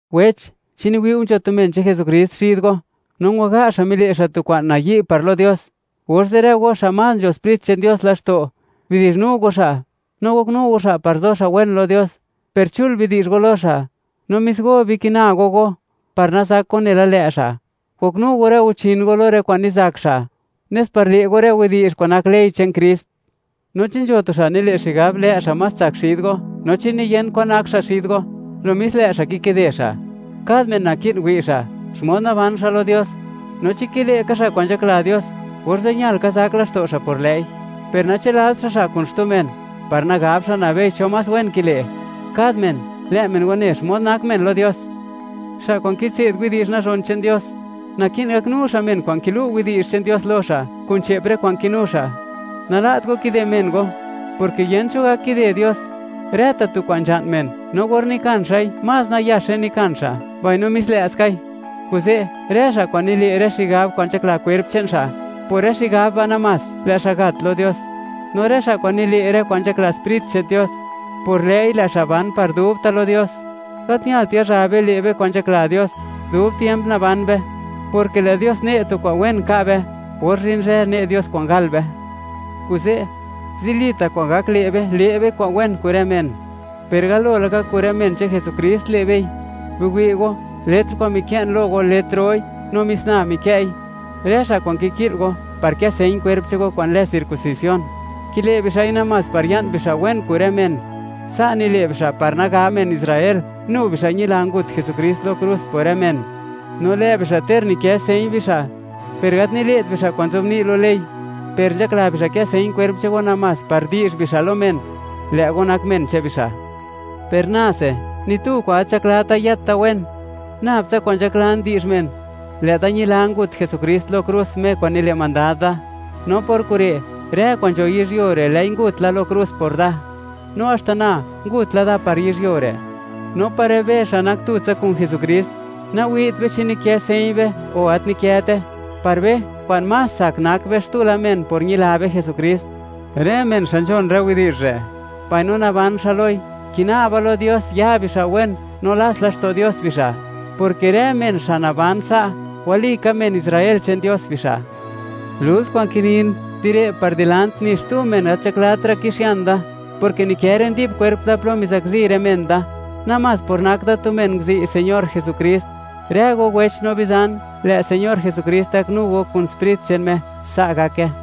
Wech, chi niwi' go nzho tu men che'n Jesukrist xid go, no ngwaga' xa' mile' xa' tu kwa'n nayi' par lo Dios, orze', rë go xa' más nzho Sprit che'n Dios laxto', bidi'zhnu go xa', no goknu go xa' par zo xa' wen lo Dios; per chul bidi'zh go lo xa', no mis go bikina go go par nazak go nela lë' xa'. Goknu go rë guchin go lo rë kwa'n nizak xa', nes par le' go rë widi'zh kwa'n nak ley che'n Krist. No chi nzho tu xa' nile' xigab, lë' xa' más tsak xid go, no chi niyent kwan nak xa' xid go; lo mis lë' xa' kikide xa'. Kad men naki'n wi' xa', xmod naban xa' lo Dios, no chi kile' ka xa' kwa'n nzhakla Dios, orze' ñal ka zak laxto' xa' por lë'i; per nachë'lalt xa' xa' kun xtu men, par nagab xa' nabei cho más wen kile'. Kad men, lë' men wane xmod nak men lo Dios. Xa' kwa'n kitse'd widi'zh nazhon che'n Dios, naki'n gaknu xa' men kwa'n kilu' widi'zh che'n Dios lo xa', kun che'p rë kwa'n kinu xa'. Nala't go kide men go, porke yent cho gak kide Dios: Rë ta' tu kwa'n nzha'n men, no or nikan xa'i, más nayaxe nikan xa', mbaino mis lë' skai. Kuze', rë xa' kwa'n nile' rë xigab kwa'n nzhakla kwerp che'n xa', por rë xigab ba' namás lë' xa' gat lo Dios; no rë xa' kwa'n nile' rë kwa'n nzhakla Sprit che'n Dios, por lë'i lë' xa' ban par dubta' lo Dios. Gat ñalt yazha be, le' be kwa'n nzhakla Dios, dub tiemp naban be, porke lë' Dios ne' tu kwa'n wen ka' be, or zhin zhë ne' Dios kwa'n gal be. Kuze', zilita' kwa'n gak le' be, le' be kwa'n wen kun rë men, per galo laka kun rë men che'n Jesukrist le' bei. Biwi' go, letr kwa'n mikë'n lo go, letr roi, no mis na mikë'i. Rë xa' kwa'n kiki'l go, par kë señ kwerp che'n go kwa'n lë circuncisión, kile' bixa'i namás par ya'n bixa' wen kun rë men; sa' nile' bixa' par nagab men Israel, nu bixa' ñila, ngut Jesukrist lo krus por rë men. No lë' bixa', ter nikë' señ bixa', per gat nile't bixa' kwa'n nzobni' lo ley; per nzhakla bixa' kë señ kwerp che'n go, namás par di'zh bixa' lo men, lë' go nak men che'n bixa'. Per nase, ni tu kwa'n gat nzhaklata' yët da wen. Nabtsa kwa'n nzhaklan di'zh men, lë' da ñila, ngut Jesukrist lo krus, Me kwa'n nile' mandad da. No por kure', rë kwa'n nzho yizhyuo re', lë'i ngut la lo krus por da, no haxta na ngut la da par yizhyuo re'. No par rë be, xa' nak tutsa kun Jesukrist, nawi't be chi nikë señ be, o gat nikëte; par be, kwa'n más tsak nak be xtu men por ñila be Jesukrist. Rë men xa' nzhon rë widi'zh re', mbaino naban xa' loi, kina'ba lo Dios, ya bixa' wen, no lats laxto' Dios bixa', porke rë men xa' naban sa', walika men Israel che'n Dios bixa'. Lult kwa'n kinin, di re' par dilant, ni xtu men gat nzhaklatra' kixian da, porke nikë rë ndi'b kwerp da plo mizakzi rë men da, namás por nak da tu men nguzi' Señor Jesukrist. Rë go wech no bizan, lë' Señor Jesukrist gaknu go kun Sprit che'n Me. Sa' gake.